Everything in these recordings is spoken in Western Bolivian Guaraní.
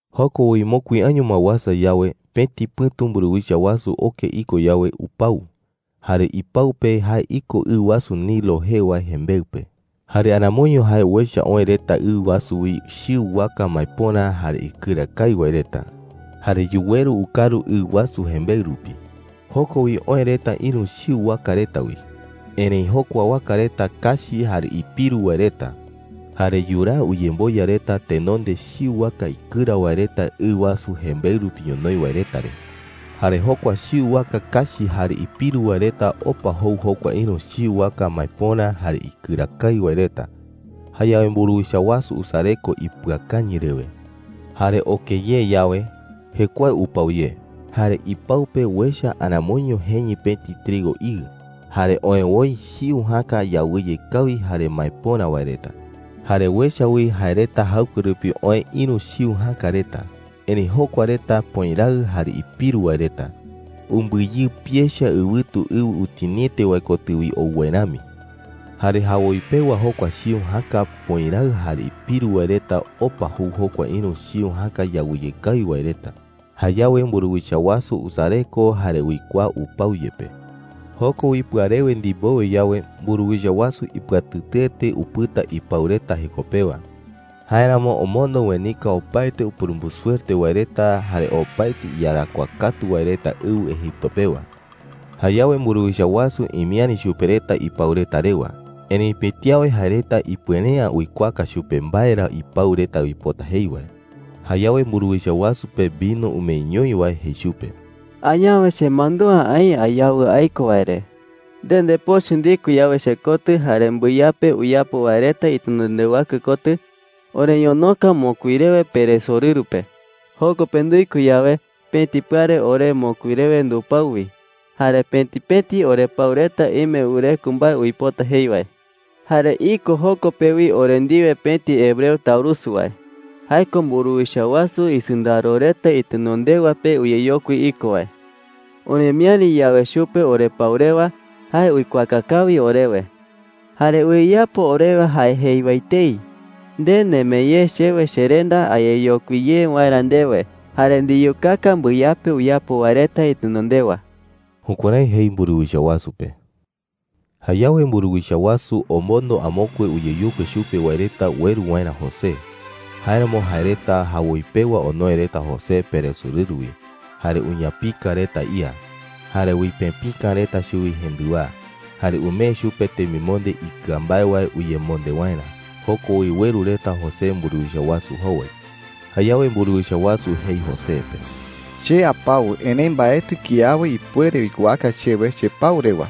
Joko wi mokui año ma uasa yawe, pëti pɨ̈tu mburuwicha wasu oke iko yawe, upau. Jare ipau pe jae iko ɨ wasu Nilo jee wae jembeɨ pe. Jare aramoiño jae uecha oë reta ɨ wasu wi chiu waka maepöra jare ikɨra kawi wae reta. Jare yuweru ukaru ɨ wasu jembeɨ rupi. Joko wi oë reta ïru chiu waka reta wi. Erëi jokua waka reta kachi jare ipiru wae reta. Jare yuraa uyemboya reta tenonde chiu waka ikɨra wae reta ɨ wasu jembeɨ rupi ñonoï wae reta re. Jare jokua chiu waka kachi jare ipiru wae reta opa jou jokua ïru chiu waka maepöra jare ikɨra kawi wae reta. Jayawe mburuwicha wasu usareko ipɨakañɨ rewe. Jare oke ye yawe, jekuae upau ye. Jare ipau pe uecha aramoiño jeñɨ pëti trigo iɨ, jare oë woi chiu jäka yawɨye kawi jare maepöra wae reta. Jare uecha wi jae reta jaɨkue rupi oë ïru chiu jäka reta. Erëi jokua reta pöiraɨ jare ipiru wae reta, umbɨyɨpi echa ɨwɨtu ɨwɨ utiniete wae kotɨ wi ou wae rami. Jare jawoi pewa jokua chiu jäka pöiraɨ jare ipiru wae reta opa jou jokua ïru chiu jäka yawɨye kawi wae reta. Jayawe mburuwicha wasu usareko jare uikuaa upau yepe. Joko wi pɨarewe ndimbowe yawe, mburuwicha wasu ipɨatɨtɨete upɨta ipau reta jeko pewa. Jáeramo omondo uenika opaete upurumbusuerte wae reta jare opaete iyarakuaa katu wae reta ɨwɨ Egipto pewa. Jayawe mburuwicha wasu imiäri chupe reta ipau reta rewa. Erëi pëti awe jae reta ipuere’ä uikuaaka chupe mbae ra ipau reta uipota jei wae. Jayawe mburuwicha wasu pe vino umeeñoi wae jei chupe: “Añawe chemandúa aï ayawɨ aiko wae re,” jei. “Nde ndepochɨ ndiko yawe chekotɨ jare mbɨyape uyapo wae reta itenondewakue kotɨ, oreñonoka mokui rewe peresorɨru pe,” jei chupe. “Joko pe nduiko yawe, pëti pɨare ore mokui rewe ndupau wi. Jare pëti pëti orepau reta ime wɨreko mbae uipota jei wae,” jei chupe. “Jare iko joko pe wi ore ndiwe pëti hebreo taurusu wae. Jae ko mburuwicha wasu isɨndaro reta itenondewa pe uyeyokui iko wae. Oremiäri yawe chupe orepau rewa, jae uikuaaka kawi orewe,” jei chupe. “¡Jare uyeyapo orewe jae jei wae etei! Nde nemee ye chewe cherenda ayeyokui ye waerä ndewe, jare ndiyukaka mbɨyape uyapo wae reta itenondewa.” Jukuärái jei mburuwicha wasu pe. Jayawe mburuwicha wasu omondo amokue uyeyokui chupe wae reta ueru waerä José. Jáeramo jae reta jawoi pewa onoe reta José peresorɨru wi, jare uñapika reta ía, jare uipëpika reta chuwi jendɨwaa, jare umee chupe temimonde ikɨa mbae wae uyemonde waerä. Joko wi ueru reta José mburuwicha wasu jowai. Jayawe mburuwicha wasu jei José pe: “Che apau, erëi mbaetɨ kiawe ipuere uikuaaka chewe chepau rewa,”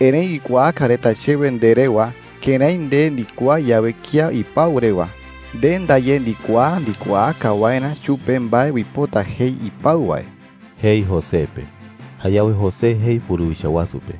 jei. “Erëi uikuaaka reta chewe nde rewa, kërái nde ndikuaa yawe kía ipau rewa, nde ndaye ndikuaa ndikuaaka waerä chupe mbae uipota jei ipau wae,” jei José pe. Jayawe José jei mburuwicha wasu pe: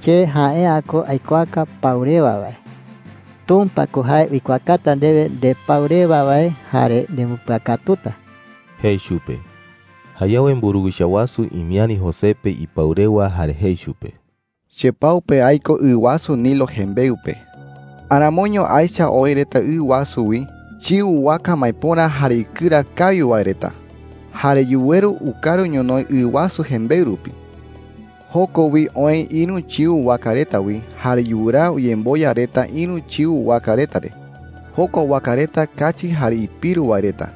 “Che jae’ä ko aikuaaka pau rewa wae. Tumpa ko jae uikuaakata ndewe ndepau rewa wae jare nembɨpɨakatuta,” jei chupe. Jayawe mburuwicha wasu imiäri José pe ipau rewa jare jei chupe: “Chepau pe aiko ɨ wasu Nilo jembeɨ pe. Aramoiño aecha oë reta ɨ wasu wi chiu waka maepöra jare ikɨra kawi wae reta. Jare yuweru ukaru ñonoï ɨ wasu jembeɨ rupi,” jei chupe. “Joko wi oë ïru chiu waka reta wi jare yuraa uyemboya reta ïru chiu waka reta re. Jokua waka reta kachi jare ipiru wae reta,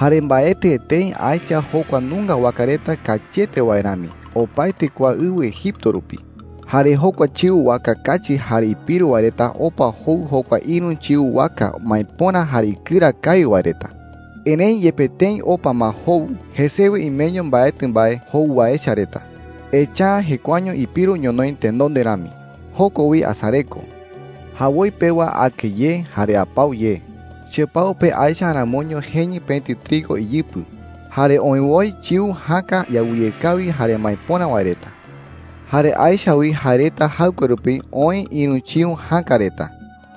jare mbaetɨ etei aecha jokua nunga waka reta kachiete wae rami opaete kua ɨwɨ Egipto rupi,” jei chupe. “Jare jokua chiu waka kachi jare ipiru wae reta opa jou jokua ïru chiu waka maepöra jare ikɨra kawi wae reta. Erëi yepe tëi opa ma jou, jesewe imeño mbaetɨ mbae jou wae echa reta, echa’ä jekuaeño ipiru ñonoï tenonde rami. Joko wi asareko,” jei chupe. “Jawoi pewa ake ye jare apau ye. Chepau pe aecha aramoiño jeñɨ pëti trigo iyɨpɨ, jare oë woi chiu jäka yawɨye kawi jare maepöra wae reta. Jare aecha wi jae reta jaɨkue rupi oë ïru chiu jäka reta.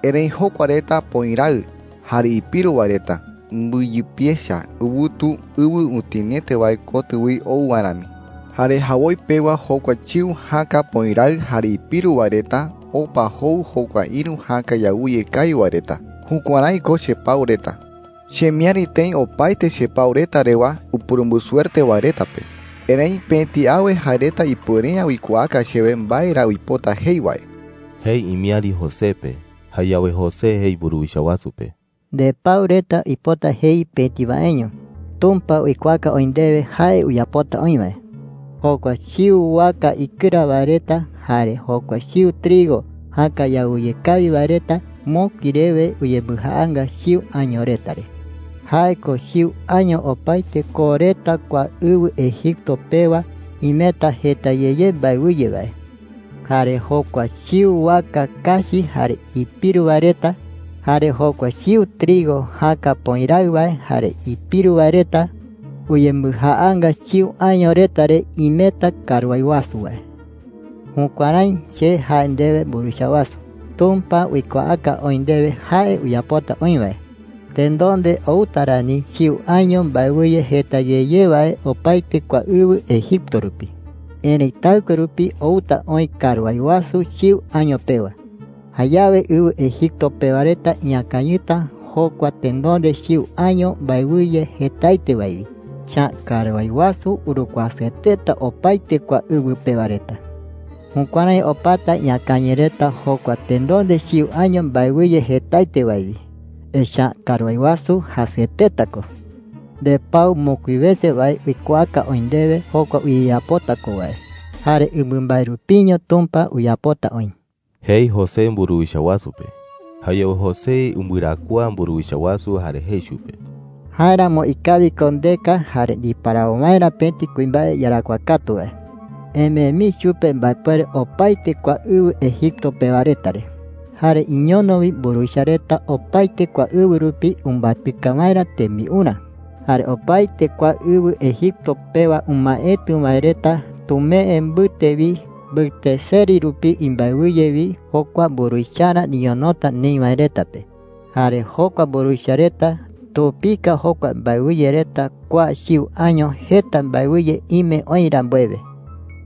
Erëi jokua reta pöiraɨ jare ipiru wae reta, umbɨyɨpi echa ɨwɨtu ɨwɨ utiniete wae kotɨ wi ou wae rami,” jei chupe. “Jare jawoi pewa jokua chiu jäka pöiraɨ jare ipiru wae reta opa jou jokua ïru jäka yawɨye kawi wae reta. Jukuärái ko chepau reta,” jei chupe. “Chemiäri tëi opaete chepau reta rewa upurumbusuerte wae reta pe. Erëi pëti awe jae reta ipuere’ä uikuaaka chewe mbae ra uipota jei wae,” jei imiäri José pe. Jayawe José jei mburuwicha wasu pe: “Ndepau reta uipota jei pëti waeño,” jei. “Tumpa uikuaaka oï ndewe jae uyapota oï wae,” jei chupe. “Jokua chiu waka ikɨra wae reta jare jokua chiu trigo jäka yawɨye kawi wae reta mokui rewe uyembɨjaanga chiu año reta re. Jae ko chiu año opaete koo reta kua ɨwɨ Egipto pewa imeta jeta ye ye mbaewɨye wae,” jei. “Jare jokua chiu waka kachi jare ipiru wae reta jare jokua chiu trigo jäka pöiraɨ wae jare ipiru wae reta uyembɨjaanga chiu año reta re imeta karuái wasu wae,” jei chupe. “Jukuärái che jae ndewe, mburuwicha wasu, Tumpa uikuaaka oï ndewe jae uyapota oï wae,” jei. “Tenonde outa rani chiu año mbaewɨye jeta ye ye wae opaete kua ɨwɨ Egipto rupi,” jei. “Erëi taɨkue rupi outa oï karuái wasu chiu año pewa. Jayawe ɨwɨ Egipto pewa reta iñakañɨta jokua tenonde chiu año mbaewɨye jetaete wae wi, echa’ä karuái wasu urukuasɨeteta opaete kua ɨwɨ pewa reta,” jei. “Jukuärái opata iñakañɨ reta jokua tenonde chiu año mbaewɨye jetaete wae wi, echa’ä karuái wasu jasɨeteta ko,” jei. “Ndepau mokui wese wae uikuaaka oï ndewe jokua uyeyapota ko wae, jare ɨmambae rupiño Tumpa uyapota oï,” jei José mburuwicha wasu pe. Jayawe José umbɨarakuaa mburuwicha wasu jare jei chupe: “Jáeramo ikawi ko ndeka jare ndiparawo waerä pëti kuimbae iyarakuaa katu wae,” jei. “Emee mii chupe mbaepuere opaete kua ɨwɨ Egipto pewa reta re,” jei. “Jare iñono wi mburuwicha reta opaete kua ɨwɨ rupi umbatɨka waerä tembiurä,” jei. “Jare opaete kua ɨwɨ Egipto pewa umaetɨ wae reta tumee mbɨte wi mbɨte seri rupi imbaewɨye wi jokua mburuwicharä niñonota neï wae reta pe. Jare jokua mburuwicha reta tupika jokua mbaewɨye reta kua chiu año jeta mbaewɨye ime oï rambuewe,” jei.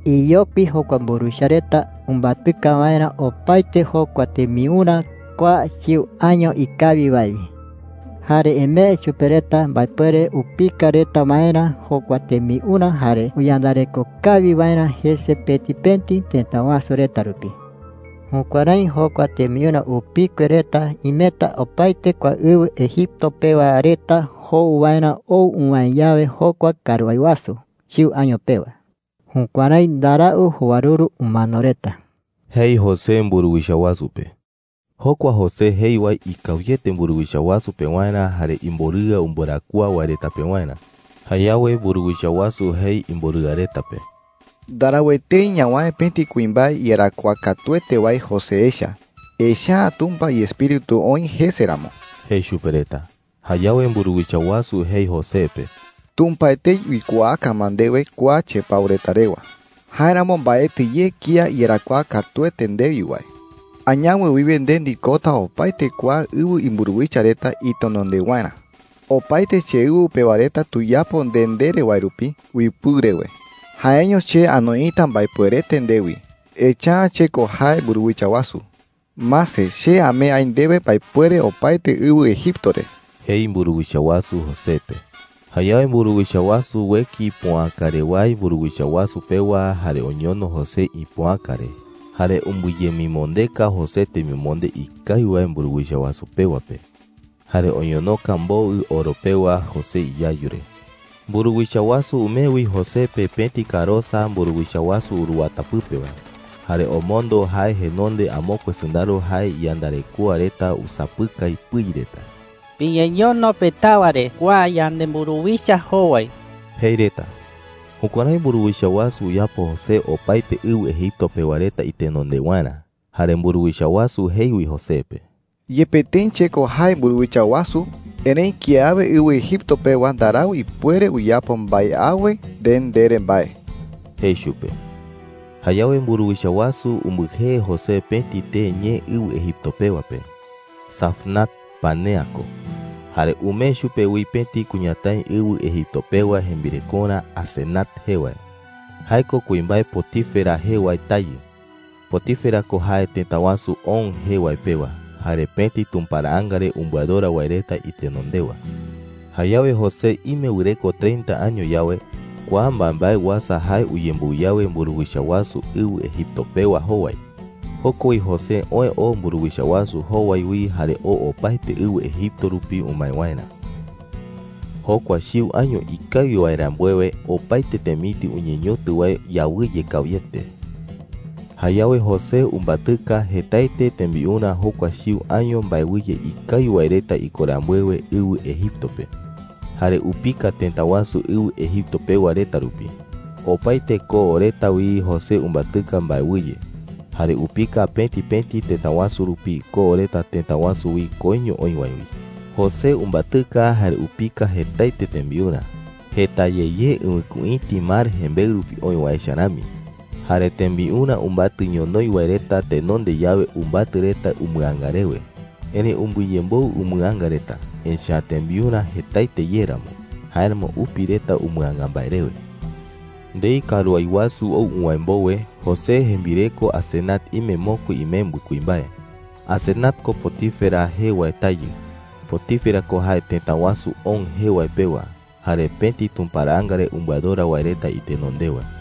“Iyokui jokua mburuwicha reta umbatɨka waerä opaete jokua tembiurä kua chiu año ikawi wae wi,” jei. “Jare emee chupe reta mbaepuere upika reta waerä jokua tembiurä jare uyandareko kawi waerä jese pëti pëti tëta wasu reta rupi,” jei. “Jukuärái jokua tembiurä upikue reta imeta opaete kua ɨwɨ Egipto pewa reta jou waerä ou uwäe yawe jokua karuái wasu chiu año pewa,” jei. “Jukuärái ndarau jowaruru umano reta,” jei José mburuwicha wasu pe. Jokua José jei wae ikawiete mburuwicha wasu pewarä jare imborɨa umbɨarakuaa wae reta pewarä. Jayawe mburuwicha wasu jei imborɨa reta pe: “Ndarau etei ñawäe pëti kuimbae iyarakuaa katuete wae José echa, echa’ä Tumpa iEspíritu oï jese ramo,” jei chupe reta. Jayawe mburuwicha wasu jei José pe: “Tumpa etei uikuaaka ma ndewe kua chepau reta rewa,” jei. “Jáeramo mbaetɨ ye kía iyarakuaa katuete ndewi wae,” jei. “Añawe wiwe nde ndikota opaete kua ɨwɨ imburuwicha reta itenondewarä,” jei chupe. “Opaete cheɨwɨ pewa reta tuyapo nde ndere wae rupi uipɨu rewe. Jaeño che anoita mbaepuerete ndewi, echa’ä che ko jae mburuwicha wasu. Mase, che amee aï ndewe mbaepuere opaete ɨwɨ Egipto re,” jei mburuwicha wasu José pe. Jayawe mburuwicha wasu ueki ipoäkarewái mburuwicha wasu pewa jare oñono José ipoäka re. Jare umbɨyemimondeka José temimonde ikawi wae mburuwicha wasu pewa pe, jare oñonoka mboɨ oro pewa José iyayu re. Mburuwicha wasu umee wi José pe pëti karosa mburuwicha wasu uruwata pɨpe wae. Jare omondo jae jenonde amokue sɨndaro jae iyandarekoa reta usapɨkai pɨi reta: “¡Piñeñono petawa re kua yanemburuwicha jowai!” jei reta. Jukuärái mburuwicha wasu uyapo José opaete ɨwɨ Egipto pewa reta itenondewarä. Jare mburuwicha wasu jei wi José pe: “Yepe tëi che ko jae mburuwicha wasu, erëi kiawe ɨwɨ Egipto pewa ndarau ipuere uyapo mbae awe nde ndere mbae,” jei chupe. Jayawe mburuwicha wasu umbɨjee José pëti tee ñee ɨwɨ Egipto pewa pe, Zafnat-panea ko. Jare umee chupe wi pëti kuñatái ɨwɨ Egipto pewa jembirekorä Asenat jee wae. Jae ko kuimbae Potifera jee wae tayɨ. Potifera ko jae tëta wasu On jee wae pewa, jare pëti tumparaanga re umbɨadora wae reta itenondewa. Jayawe José ime wɨreko treinta año yawe, kua mbaembae uasa jae uyemboɨ yawe mburuwicha wasu ɨwɨ Egipto pewa jowai. Joko wi José oë oo mburuwicha wasu jowai wi jare oo opaete ɨwɨ Egipto rupi umae waerä. Jokua chiu año ikawi wae rambuewe, opaete temitɨ uñeñotɨ wae yawɨye kawiete. Jayawe José umbatɨka jetaete tembiurä jokua chiu año mbaewɨye ikawi wae reta iko rambuewe ɨwɨ Egipto pe, jare upika tëta wasu ɨwɨ Egipto pewa reta rupi. Opaete koo reta wi José umbatɨka mbaewɨye, jare upika pëti pëti tëta wasu rupi koo reta tëta wasu wi koiño oï wae wi. José umbatɨka jare upika jetaete tembiurä, jeta ye ye ɨwɨkuïti mar jembeɨ rupi oï wae echa rami. Jare tembiurä umbatɨ ñonoï wae reta tenonde yawe umbatɨ reta umɨanga rewe. Erëi umbɨyemboɨ umɨanga reta, echa’ä tembiurä jetaete ye ramo. Jáeramo upi reta umɨanga mbae rewe. Ndei karuái wasu ou uwäe mbowe, José jembireko Asenat ime mokui imembɨ kuimbae. Asenat ko Potifera jee wae tayɨ. Potifera ko jae tëta wasu On jee wae pewa, jare pëti tumparaanga re umbɨadora wae reta itenondewa.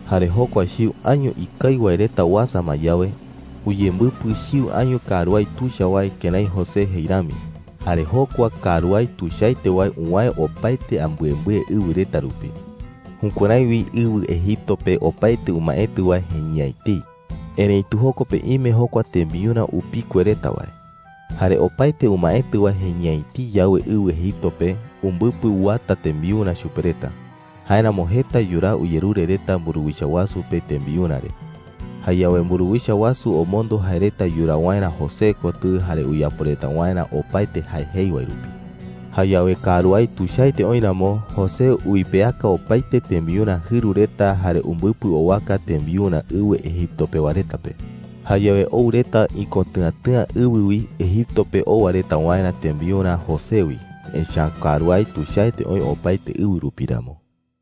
Jare jokua chiu año ikawi wae reta uasa ma yawe, uyembɨpɨ chiu año karuái tuicha wae kërái José jei rami. Jare jokua karuái tuichaete wae uwäe opaete ambɨembɨe ɨwɨ reta rupi. Jukuärái wi ɨwɨ Egipto pe opaete umaetɨ wae jeñɨ'ä etei. Erëitu joko pe ime jokua tembiurä upikue reta wae. Jare opaete umaetɨ wae jeñɨ'ä etei yawe ɨwɨ Egipto pe, umbɨpɨ uata tembiurä chupe reta. Jáeramo jeta yuraa uyerure reta mburuwicha wasu pe tembiurä re. Jayawe mburuwicha wasu omondo jae reta yuraa waerä José kotɨ jare uyapo reta waerä opaete jae jei wae rupi. Jayawe karuái tuichaete oï ramo, José uipeaka opaete tembiurä jɨru reta jare umbɨpɨ owaka tembiurä ɨwɨ Egipto pewa reta pe. Jayawe ou reta ikotɨ̈atɨ̈a ɨwɨ wi Egipto pe owa reta waerä tembiurä José wi, echa’ä karuái tuichaete oï opaete ɨwɨ rupi ramo.